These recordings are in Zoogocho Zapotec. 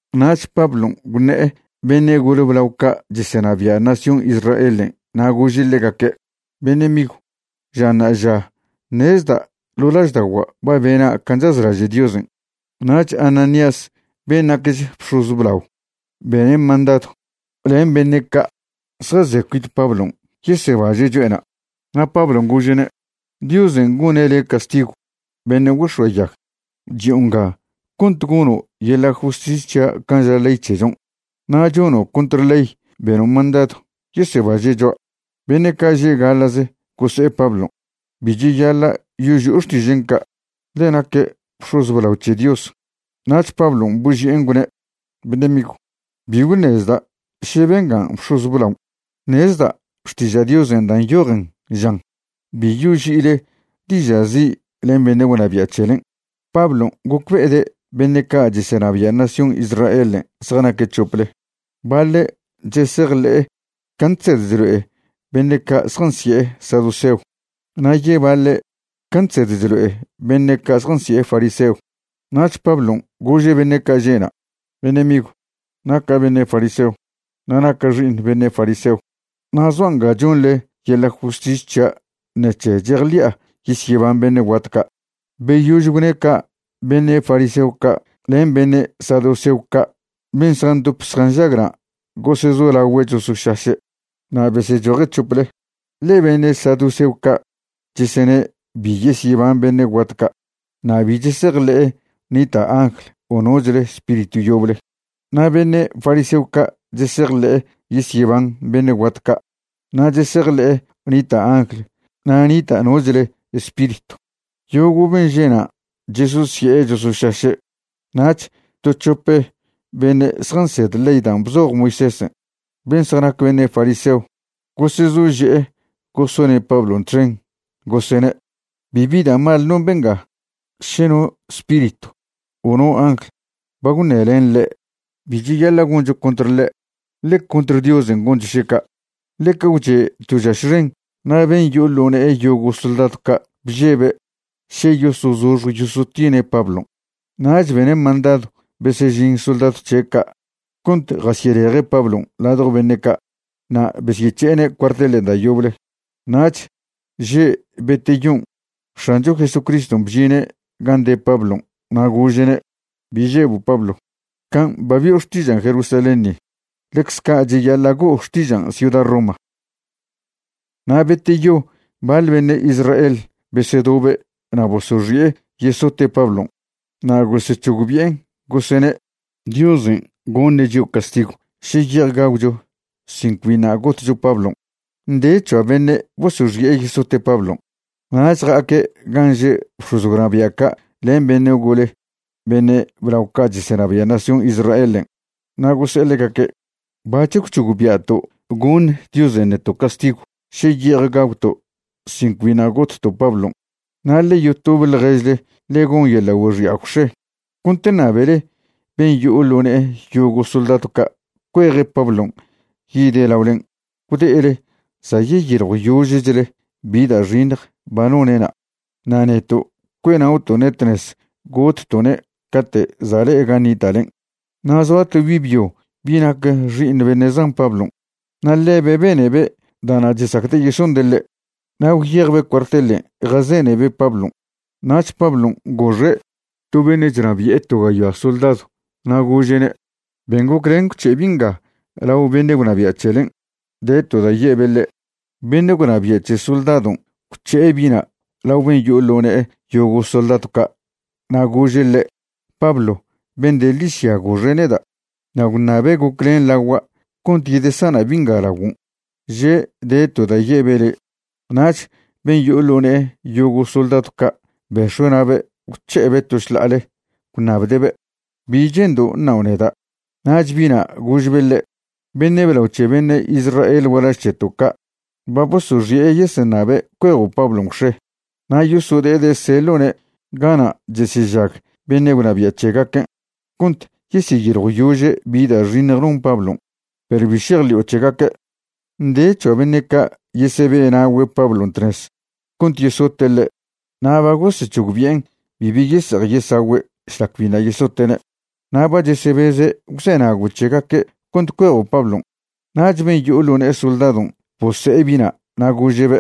Nach Pablon' gwṉe'e beṉe' gole blao ca' chesenabia' nación Israelen' na' gože' ḻegaque': ―Beṉe' migw, ža ṉa'aža ṉezda' ḻo' lažda'ogua' ba bena' can' chazlaže' Diosen'. Nach Ananías ben' nacch bx̱oz blao bene' mandadw len beṉe' ca' zjaze cuit Pablon' yesebaže' cho'ena'. Na' Pablon' gože'ne': ―¡Diosen' gone' le' castigw, beṉe' güex̱oayag! Chi'o nga cont gono' yeḻa' justis c̱hia' can' ža ley c̱hechon' na' chono' contr ley beno' mandadw yesebaže' choa'. Beṉe' ca' že' gaḻa'ze gose'e Pablon': ―Bi cheyaḻa' yoži'o xtižen' ca', ḻe naque' bx̱oz blao c̱he Dios. Nach Pablon' boži'en gwne': ―Beṉe' migw, bi gwṉezda' še benga bx̱oz blaon'. Ṉezda' Xtiža' Diosen' dan' nyojen žan: “Bi yoži'ile diža' zi' len beṉe' gwnabia' c̱helen'.” Pablon' gocbe'ede' beṉe' ca' chesenabia' nación Israelen' zjanaque' c̱hople. Baḻe' chesejḻe'e can' chsed chlo'e beṉe' ca' zjansi'e saduceo na' yebaḻe' can' chsed chlo'e beṉe' ca' zjansi'e fariseo. Nach Pablon' gože' beṉe' ca' že'na': ―Beṉe' migw, naca' beṉe' fariseo, na' naca' xi'iṉ beṉe' fariseo. Na' zoa' nga chonḻe yeḻa' justis c̱hia' ṉec̱he chejḻi'a yesyeban beṉe' guat ca'. Beyož gwne' ca' beṉe' fariseo ca' len beṉe' saduceo ca' ben' zjandop zjanžag na' gosezolagüe' chosošaše', na' besechoje' c̱hople. Ḻe beṉe' saduceo ca' chesene' bi yesyeban beṉe' guat ca' na' bi chesejḻe'e nita' angl o nochle spiritw yoble. Na' beṉe' fariseo ca' chesejḻe'e yesyeban beṉe' guat ca' na' chesejḻe'e nita' angl na' nita' nochle spiritw. Yogo' ben' že'na' chesosye'e chosošaše'. Nach to c̱hope beṉe' zjansed ley dan' bzoj Moisésen', ben' zjanac beṉe' fariseo, gosezože'e gosone' Pablon' txen, gosene': ―Bibi da' mal non benga. Še no spiritw o no angl ba gwṉelen ḻe', bi cheyaḻa' goncho contr ḻe', ḻe contr Diosen' goncho še ca'. Ḻeca gwche' to žaš xen na' ben' yo'o ḻo ne'e yogo' soldadw ca' bžebe' še yosozoxj yosotine' Pablon'. Nach bene' mandadw besežin soldadw c̱he' ca' cont jasyeleje' Pablon' ladjo beṉe' ca' na' besyec̱he'ene' cuartelen' da' yoble. Nach že' beteyon' X̱ancho Jesucriston' bžine' gan' de Pablon' na' gože'ne': ―Bi žebo' Pablo. Can' ba bi'o xtižan' Jerusalén ni, ḻecz ca' cheyaḻa' go'o xtižan' ciuda Roma. Na' beteyo baḻ beṉe' Israel besedobe' na' bosoxi'e yesote' Pablon'. Na' gosec̱hogbi'en, gosene': ―Diosen' goṉe' chio' castigw še ye'ej gagwcho sin cbiṉa' gotcho Pablon'. Nde c̱hoa beṉe' bosoxi'e yesote' Pablon'. Nach ja'aque' gan' že' bx̱oz gwnabia' ca' len beṉe' gole beṉe' blao ca' chesenabia' nación Israelen' na' gose'e ḻegaque': ―Bac̱h gwc̱hogbia'to' goṉ Diosen' neto' castigw še ye'ej gagwto' sin cbiṉa' gotto' Pablon'. Na' ḻe yotobe ḻježle ḻe gon yeḻa' güexi'a gwx̱e cont ṉabele ben' yo'o ḻo ne'e yogo' soldadw ca' cueje' Pablon' yide' laolen', gwde'ele za' yeyiḻjwyožechle bi da' xiṉj ba none'na'. Na' neto' cue'na'oto'ne' tnez gotto'ne' cate' za' le'e gan' nita'len'. Na' zoa to bi' byo bi' nac xi'iṉ beṉe' zan Pablon' na' ḻebe' benebe' da'na' chesacde' yesonde' ḻe'. Na' gwyejbe' cuartelen' jazenebe' Pablon'. Nach Pablon' goxe' to beṉe' chnabi'e to gayoa soldadw na' gože'ne': ―Ben goclen gwc̱he' bi' nga lao beṉe' gwnabia' c̱helen'. De to da' ye'be' ḻe'. Beṉe' gwnabia' c̱he soldadon' gwc̱he'e bi'na' lao ben' yo'o ḻo ne'e yogo' soldadw ca' na' gože' ḻe': ―Pablo ben' de ḻižya goxe' neda' na' gwṉabe' goclen lagua' cont zedesana' bi' nga laguon', že' de to da' ye'be' le'. Nach ben' yo'o ḻo ne'e yogo' soldadw ca' bex̱ue' na'be' gwc̱he'ebe' to šḻa'ale gwṉabde'be': ―¿Bi che'ndo' ṉao' neda'? Nach bi'na' gožbe' ḻe': ―Beṉe' blao c̱he beṉe' Israel gualaž c̱heto' ca' ba bosoxi'e yeseṉabe' cuejo' Pablon' gwx̱e na' yosode'ede' seḻo'ne' gana' chesežag beṉe' gwnabia' c̱hegaquen' cont yeseyiljwyože' bi da' xiṉj non Pablon'. Perw bi šejḻi'o c̱hegaque'. Nde c̱hoa beṉe' ca' yesebe'na'ogüe' Pablon' tnez cont yesote' ḻe' na' ba gosec̱hogbi'en bibi yese'ej yesagüe' šlac biṉa' yesote'ne'. Na' ba chesebeze' gwzenago' c̱hegaque' cont cuejo' Pablon'. Nach ben' yo'o ḻo ne'e soldadon' bose'e bi'na' na' gože'be':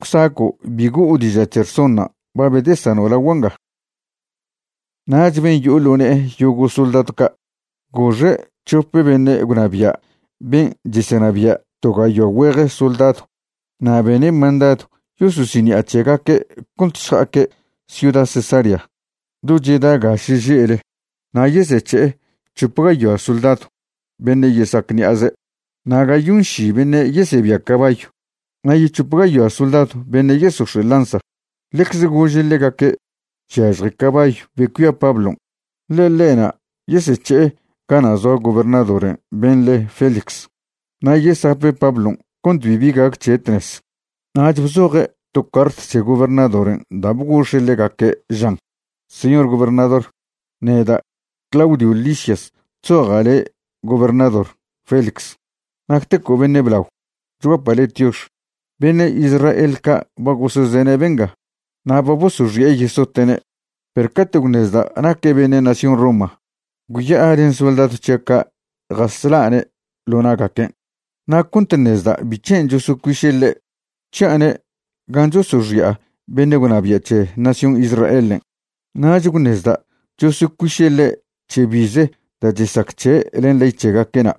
―Gwsaco' bi go'o diža' c̱he rsonṉa' ba bedesano' lagua' nga. Nach ben' yo'o ḻo ne'e yogo' soldadw ca' goxe' c̱hope beṉe' gwnabia' ben' chesenabia' to gayoa güeje soldadw na' bene' mandadw yososiṉi'a c̱hegaque' cont šja'aque' ciuda Cesarea do cheda ga šeže'le na' yesec̱he'e c̱hop gayoa soldadw beṉe' yesa'ac ṉi'aze na' gayonši beṉe' yesebia cabayw na' yec̱hop gayoa soldadw beṉe' yesox̱e' lanza. Ḻecze gože' ḻegaque' chyažje cabayw be cuia Pablon', ḻe ḻe'na' yesec̱he'e gana' zoa gobernadoren' ben' le Félix, na' yesape' Pablon' cont bibi gac c̱he' tnez. Nach bzoje' to cart c̱he gobernadoren' da' bgox̱e' ḻegaque', žan: “Señor Gobernador: Neda' Claudio Lisias chzoja' ḻe' gobernador Félix, nacteco' beṉe' blao, chguapa' le' tiox. Beṉe' Israel ca' ba gosezene' benga na' ba bosoxi'e yesote'ne', perw cate' gwṉezda' naque' beṉe' nación Roma, gwya'a len soldadw c̱hia' ca' jasla'ne' ḻo na'gaquen'. Na' cont ṉezda' bic̱hen' chosocuiše' ḻe', gwc̱hi'ane' gan' chosoxi'a beṉe' gwnabia' c̱he nación Israelen'. Nach gwṉezda' chosocuiše' ḻe' c̱he bize da' chesac c̱he' len ley c̱hegaque'na',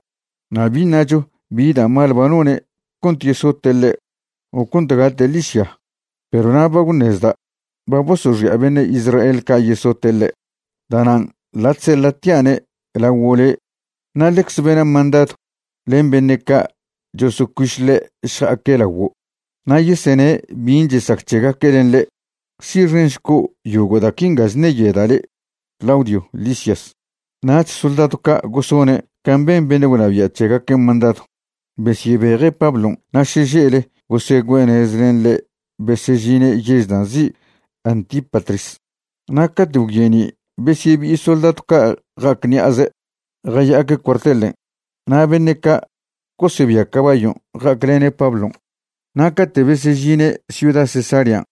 na' bi ṉacho bi da' mal ba none' cont yesote' ḻe' o cont gate' ḻižya. Perw na' ba gwṉezda' ba bosoxi'a beṉe' Israel ca' yesote' ḻe', da'nan' ḻa' chseḻa'tia'ne' laguo' le' na' ḻecze bena' mandadw len beṉe' ca' chosocuiš ḻe' šja'aque' laguo' na' yesene' bin' chesac c̱hegaque' len ḻe'. Si'xenšco' yogo' da' quinga chṉeyoeda' le'. Claudio Lisias.” Nach soldadw ca' gosone' can' ben beṉe' gwnabia' c̱hegaquen' mandadw, besyebeje' Pablon' na' šeže'le gosegüe'e nez len ḻe' besežine' yež da' nzi' Antípatris. Na' cate' gwyeni' besyebi'i soldadw ca' ja'ac ṉi'aze' jaya'aque' cuartelen' na' beṉe' ca' gosebia cabayon' ja'aclene' Pablon'. Na' cate' besežine' ciuda Cesarean'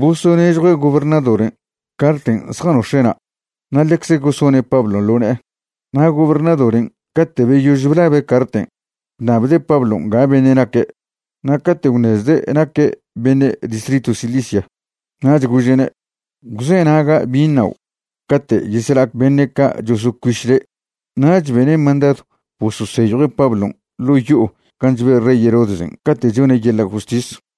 bosonežjue' gobernadoren' carten' zjanox̱e'na' na' ḻecz gosone' Pablon' ḻo ne'e. Na' gobernadoren' cate' beyož blabe' carten' gwṉabde' Pablon' ga beṉe' naque'. Na' cate' gwṉezde' naque' beṉe' distritw Cilicia, nach gože'ne': ―Gwzenaga' bin' ṉao' cate' yesela'ac beṉe' ca' chosocuiš le'. Nach bene' mandadw bososeyjue' Pablon' ḻo' yo'o gan' chbe' rey Herodesen' cate' chone' yeḻa' justis.